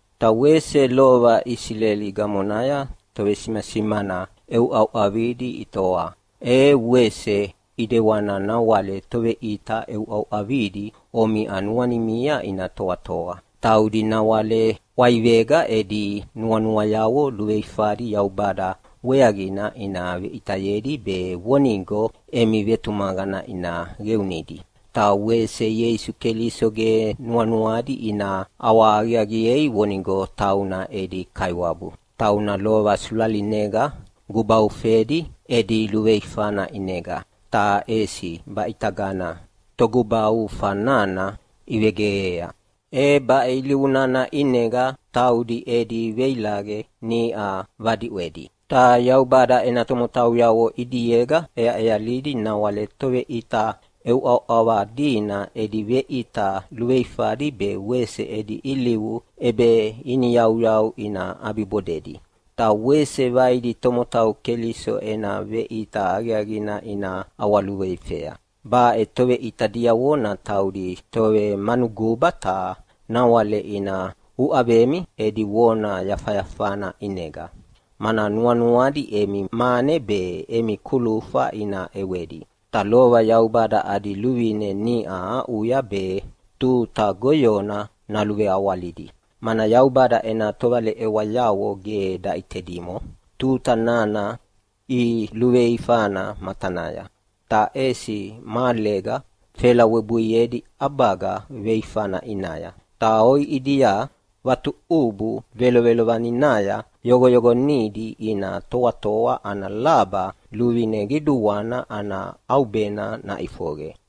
Ta wese lova Isileli gamonaya tovesimasimana ʼeʼeuʼauʼavadi itoa, e wese ʼidewana nawale toveʼita ʼeʼeuʼauʼavadi omiʼa nuanimia ina toatoa. Taudi nawale ʼwaivega edi nuanuayavo luveifadi Yaubada weaqina ina veʼitayedi be vonigo emi vetumaqana ina qeunidi. Ta wese Ieisu Keliso ge nuanuadi ina ʼawahaqiaqiei vonigo tauna edi Kaiwabu, tauna lova sulalinega gubaufedi edi luveifana ʼinega. Ta ʼesi baʼitagana Togubaufa nana ivegeqea. E baʼe ilivu nana ʼinega taudi edi veilaqe niʼa vadiʼwedi. Ta Yaubada ena tomotauyavo ʼidiega ʼeaʼealidi nawale toveʼita ʼeʼeuʼauʼava dina edi veʼita luveifadi be wese edi ilivu ʼebeiniyauyau ina ʼabibodedi. Ta wese vaidi tomotau Keliso ena veʼita aqiaqina ina ʼawaluveifea. Baʼe toveʼita diavona taudi tovemanuguba ta nawale ina uʼavemi edi vona yafayafana ʼinega, mana nuanuadi emi mane be emi kulufa ina ʼewedi. Ta lova Yaubada adi luvine niʼa aʼuya be tuta goyona naluveawalidi. Mana Yaubada ena tovaleʼewayavo ge daʼitedimo tuta nana iluveifana matanaya. Ta ʼesi mahalega felawebuiedi ʼabaga veifana ʼinaya, ta oiʼidia vatuʼubu velovelovaninaya yoqoyoqonidi ina toatoa ana laba luvine qiduana ana ʼaubena naʼifoqe.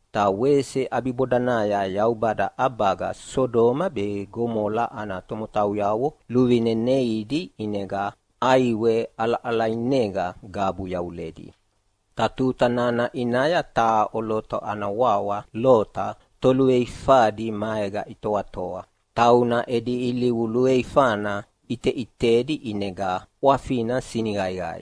Ta wese ʼabibodanaya Yaubada ʼabaga Sodoma be Gomola ana tomotauyavo luvine neidi ʼinega ʼaiwe ʼalaʼalainega gabu yavuledi. Ta tuta nana ʼinaya taha ʼoloto ana wawa Lota toluveifadi maega itoatoa. Tauna edi ilivu luveifana ʼiteʼitedi ʼinega ʼwafina siniqaiqai.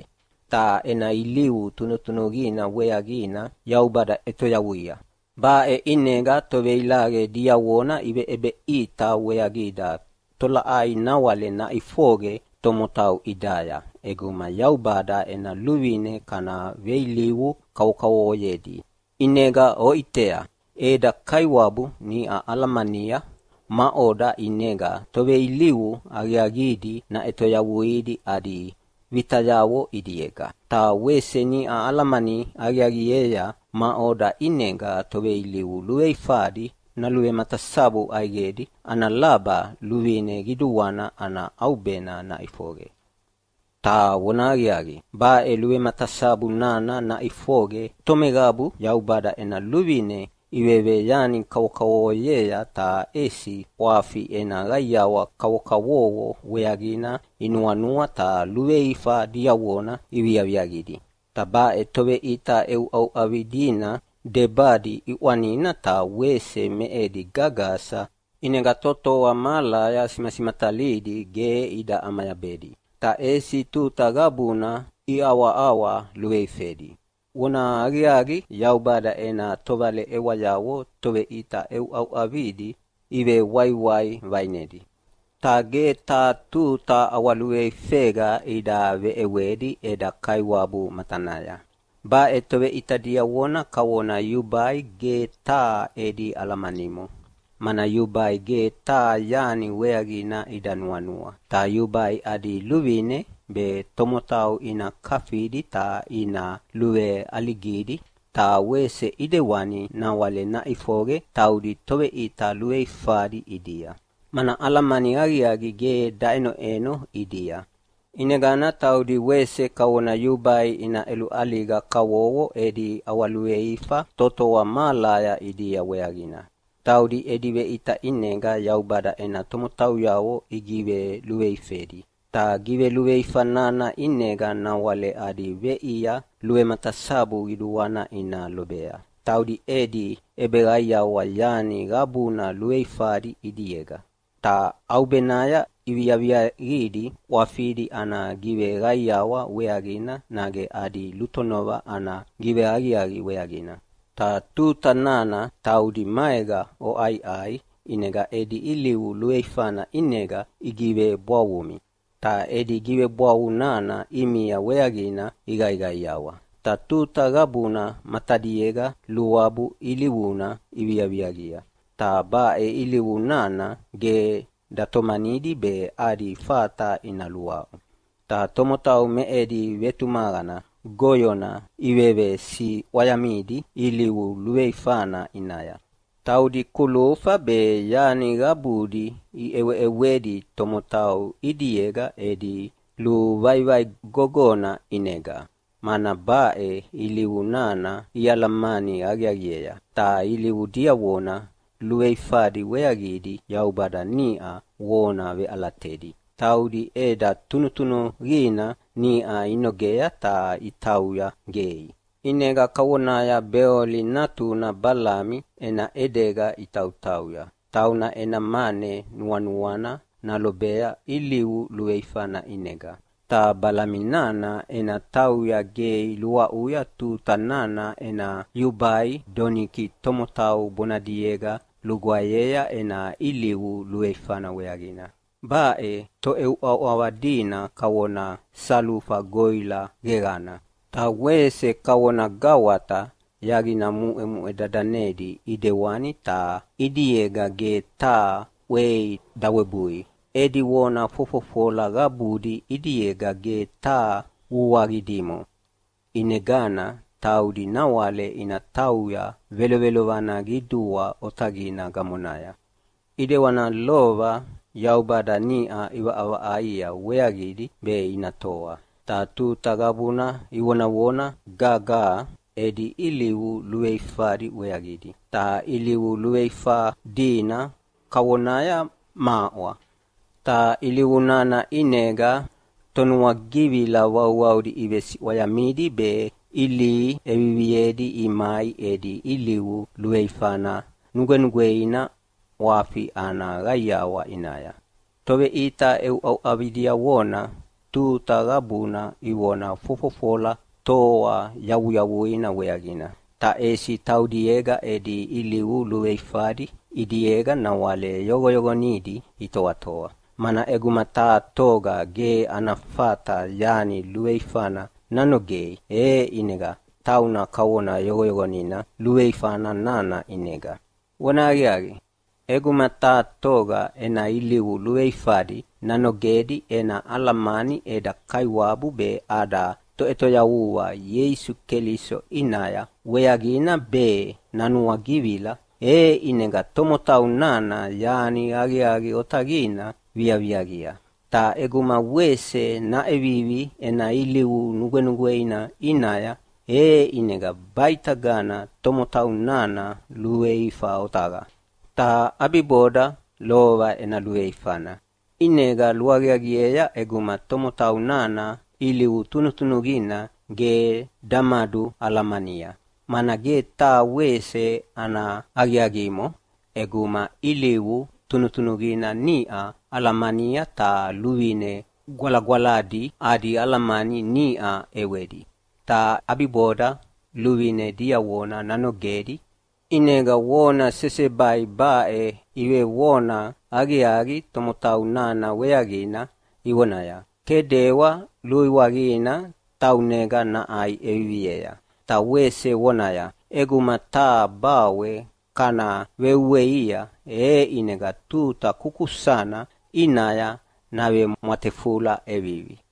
Ta ena ilivu tunutunuqina weaqina Yaubada ʼetoyavuia. Baʼe ʼinega toveilaqe diavona iveʼebeʼita weaqida tolaʼai nawale naʼifoqe tomotau ʼidaya ʼeguma Yaubada ena luvine kana veilivu kavokavovoyedi. ʼInega oʼitea, eda Kaiwabu niʼa alamania maʼoda ʼinega toveilivu aqiaqidi naʼetoyavuidi adi vitayavo ʼidiega, ta wese niʼa alamani aqiaqiea maʼoda ʼinega toveilivu luveifadi naluvematasabu ʼaiqedi ana laba luvine qiduana ana ʼaubena naʼifoqe. Ta vonahaqiaqi, baʼe luvematasabu nana naʼifoqe tomeqabu Yaubada ena luvine iveveyani kavokavovoyea ta ʼesi ʼwafi ena qaiawa kavokavovo weaqina inuanua ta luveifa diavona iviaviaqidi. Ta baʼe toveʼita ʼeʼeuʼauʼava dina debadi ʼiʼwanina ta wese me edi gagasa, ʼinega totoa mahalaya simasimatalidi ge ida ʼamayabedi, ta ʼesi tuta qabuna iʼawaʼawa luveifedi. Vonahaqiaqi, Yaubada ena tovaleʼewayavo toveʼita ʼeʼeuʼauʼavidi ivewaiwai vaʼinedi, ta ge taha tuta ʼawaluveifega ida veʼewedi eda Kaiwabu matanaya. Baʼe toveʼita diavona kavona yubai ge taha edi alamanimo, mana yubai ge taha yani weaqina ida nuanua. Ta yubai adi luvine be tomotau ina kafidi ta ina luveʼaligidi. Ta wese ʼidewani nawale naʼifoqe taudi toveʼita luveifadi ʼidia, mana alamani aqiaqi ge daʼenoʼeno ʼidia. ʼInegana taudi wese kavona yubai ina ʼeluʼaliga kavovo edi ʼawaluveifa totoa mahalaya ʼidia weaqina. Taudi edi veʼita ʼinega Yaubada ena tomotauyavo igiveluveifedi, ta giveluveifa nana ʼinega nawale adi veʼia luvematasabu qiduana ina lobea. Taudi edi ʼebeqaiawa yani qabuna luveifadi ʼidiega, ta ʼaubenaya iviaviaqidi ʼwafidi ana giveqaiawa weaqina nage adi lutonova ana giveaqiaqi weaqina. Ta tuta nana taudi maega oʼaiʼai ʼinega edi ilivu luveifana ʼinega igigivebwavumi. Ta edi givebwavu nana ʼimia weaqina iqaiqaiawa. Ta tuta qabuna matadiega luabu ilivuna iviaviaqia, ta baʼe ilivu nana ge datomanidi be adi fata ina luaʼu. Ta tomotau me edi vetumaqana goyona ivevesiʼwayamidi ilivu luveifana ʼinaya. Taudi kulufa be yani qabudi iʼeweʼewedi tomotau ʼidiega edi luvaivai gogona ʼinega, mana baʼe ilivu nana ialamani aqiaqiea. Ta ilivu diavona luveifadi weaqidi Yaubada niʼa vona veʼalatedi. Taudi ʼeda tunutunuqina niʼa inogea ta itauya gei, ʼinega kavonaya Beoli natuna Balami ena ʼedega itautauya. Tauna ena mane nuanuana nalobea ilivu luveifana ʼinega. Ta Balami nana ena tauya gei luaʼuya tuta nana ena yubai doniki tomotau bonadiega lugwaeyea ena ilivu luveifana weaqina. Baʼe toʼeuʼauʼava dina kavona salufa goʼila geqana, ta wese kavona gawata yaqina muʼemuʼe dadanedi ʼidewani, ta ʼidiega ge taha ʼwei dawebui. Edi vona fofofola qabudi ʼidiega ge taha vuaqi dimo. ʼInegana taudi nawale ina tauya velovelovana qidua otaqina gamonaya, ʼidewana lova Yaubada niʼa ʼivaʼavaʼaia weaqidi be ina toa. Ta tuta qabuna ivonavona gagaha edi ilivu luveifadi weaqidi, ta ilivu luveifa dina kavonaya maʼwa. Ta ilivu nana ʼinega tonuagivila vauvaudi ivesiʼwayamidi be ilihi ʼeviviedi imai edi ilivu luveifana nugwenugweina ʼwafi ana qaiawa ʼinaya. Toveʼita ʼeuʼauʼava diavona tuta qabuna ivona fofofola toa yavuyavuina weaqina, ta ʼesi taudiega edi ilivu luveifadi ʼidiega nawale yoqoyoqonidi itoatoa. Mana ʼeguma taha toga ge ana fata yani luveifana nanogei, e ʼinega tauna kavona yoqoyoqonina luveifa nana ʼinega. Vonahaqiaqi, ʼeguma taha toga ena ilivu luveifadi nanogedi ena alamani eda Kaiwabu be ada Toʼetoyavua Ieisu Keliso ʼinaya weaqina be nanuagivila, e ʼinega tomotau nana yani aqiaqi otaqina viaqia. Ta ʼeguma wese naʼevivi ena ilivu nugwenugweina ʼinaya, e ʼinega baʼitagana tomotau nana luveifa otaqa, ta ʼabiboda lova ena luveifana. ʼInega luaqiaqiea ʼeguma tomotau nana ilivu tunutunuqina ge damadualamania. Mana ge taha wese ana aqiaqimo ʼeguma ilivu tunutunuqina niʼa alamania ta luvine gwalagwaladi adi alamani niʼa ʼewedi, ta ʼabiboda luvine diavona nanogedi! ʼInega vona sesebai baʼe ivevona aqiaqi tomotau nana weaqina ivonaya, “Kedewa luiwaqina taunega naʼai ʼeviviea.” ta wese vonaya, “ʼEguma taha bawe kana veuweia, e ʼinega tuta kukusana ʼinaya navemwatefula ʼevivi.”